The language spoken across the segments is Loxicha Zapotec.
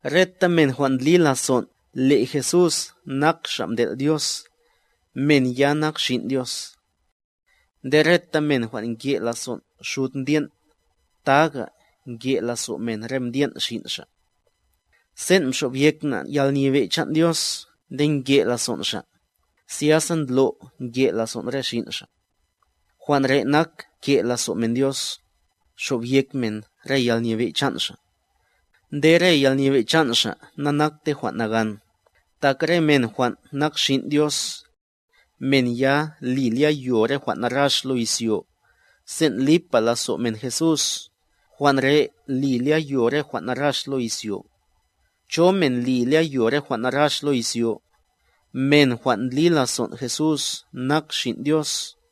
Reta men jwan' ndli lazon' le' Jesús nak Xa' mtel' Dios, men ya nak xin' Dios. Nde reta men jwan' nke' lazon' xud mdyen', taga nke' lazo' men re mdyen' xin' xa' Sen' nxobyek na' yalnyebe' chan' Dios nde nke' lazon' Xa', zyasa ndlo' nke' lazon' re xin' Xa'. Jwan' re' nak ke' lazo' men Dios, xobyek men re yalnyebe' chan' Xa'. Nde re yalnyebe' chan' Xa' na'nakte jwan' nagan, tak re men jwan' nak xin' Dios, men ya li lyayo re jwan' narax lo izyo. Sen' lipa lazo' men Jesús, jwan' re' li lyayo re jwan' narax lo izyo. ¿Cho men li lyayo re jwan' narax lo izyo? Men jwan' ndli lazon' Jesús nak Xin' Dios.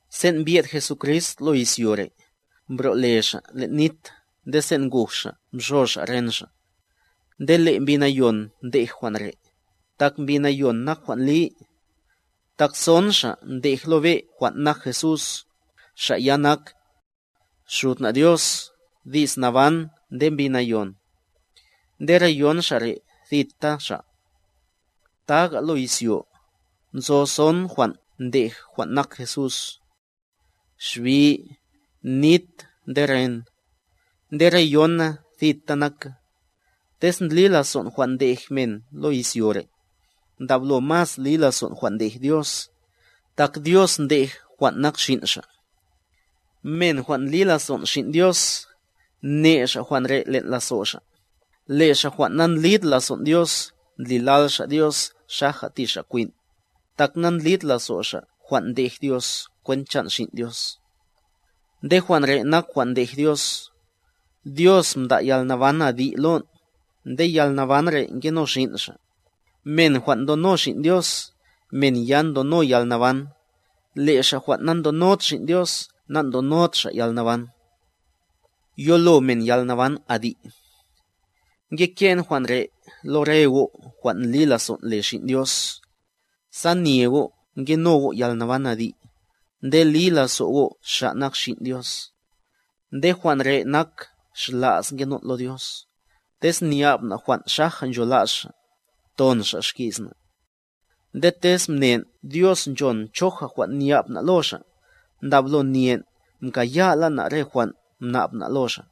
Sen' mbyed Jesucrist lo izyo re', mbro'le Xa' len' nit nde sen' nguj Xa' mxo Xa' ren Xa'. Nde le' Mbi Nayon ndej jwan' re', tak Mbi Nayon nak jwan' li. Tak son Xa' ndej lo be' jwan' nak Jesús, Xa' ya nak: Xud na' Dios, Di's Naban nde Mbi Nayon. Nde re yon Xa' re', thita Xa'. Taga' lo izyo, nzo son jwan' ndej jwan' nak Jesús: xbi, nit nde ren. Nde re yona thita naka. Tez ndli lazon' jwan' ndej men lo izyo re', ndablo mas li lazon' jwan' ndej Dios, tak Dios ndej jwan' nak Xin' Xa'. Men jwan' ndli lazon' Xin' Dios, ne' xa' jwan' re' len' lazo' xa', le' xa' jwan' na'ndlid lazon' Dios ndlilal xa' Dios xaja ti Xa' kwin', tak na'ndlid lazo' xa' jwan' ndej Dios kwent chan' Xin' Dios. Nde jwan' re' nak jwan' ndej Dios: Dios mda' yalnaban adi' lon', nde yalnaban re' ngeno Xin' Xa'. Men jwan' ndono Xin' Dios, men ya ndono yalnaban, le' xa' jwan' na'ndonod Xin' Dios na'ndonod xa' yalnaban. Yolo men yalnaban adi' Ngeke'n jwan' re' lo re go' jwan' ndli lazon' le Xin' Dios, sa nye go' ngeno go' yalnaban adi', nde li lazo' go' Xa' nak Xin' Dios. Nde jwan' re' nak xla's ngenon' lo Dios, tez nya'b na' jwan' xaja nchola's Xa', ton Xa' xki's na'. Nde tez mnen' Dios nchon choja jwan' nya'b na' lo Xa', ndablo nyen' mkaya'la na' re jwan' mna'b na' lo Xa'.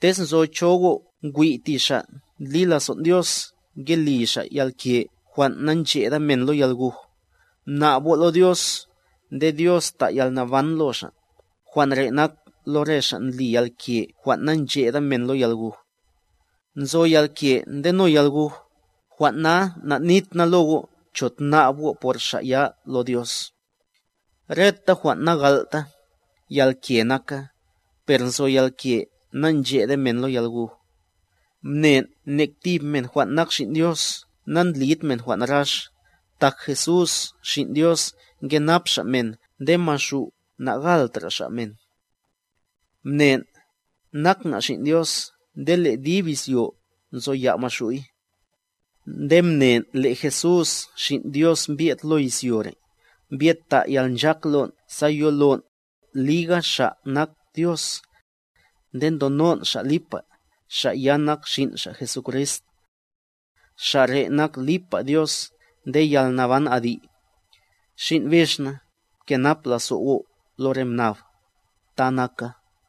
Tez nzo cho go' ngwi' ti xa' ndli lazon' Dios ngeli xa' yalke jwan' na'ncheda men lo yalguj, mna'b go' lo Dios, nde Dios ta' yalnaban lo xa', jwan' re' nak lo re xa' ndli yalke jwan' na'ncheda men lo yalguj. Nzo yalke ndeno yalguj, jwan' na na'nit na lo go' cho tna'b go' por xa' ya lo Dios. Reta jwan' na'gal'ta, yalke naka, per nzo yalke na'nchede men lo yalguj. Mnen' nek tib men jwan' nak xin' Dios na'ndlid men jwan' narax, tak Jesús Xin' Dios nkenap Xa' men nde maxu' na'galtra' xa' men. Mnen', nak na' xin' Dios nde le' dib izyo nzoya' maxu'y. Nde mnen' le' Jesús Xin' Dios mbyed lo izyo re', mbyed ta' yalnchak lon' sa yolon', liga Xa' nak Dios. Nde ndonon' Xa' lipa, Xa' ya nak Xin' Xa' Jesucrist. Xa' re' nak lipa Dios nde yalnaban adi'. Xin' bix na, pkenap lazo' go' lo re mnab. Ta naka.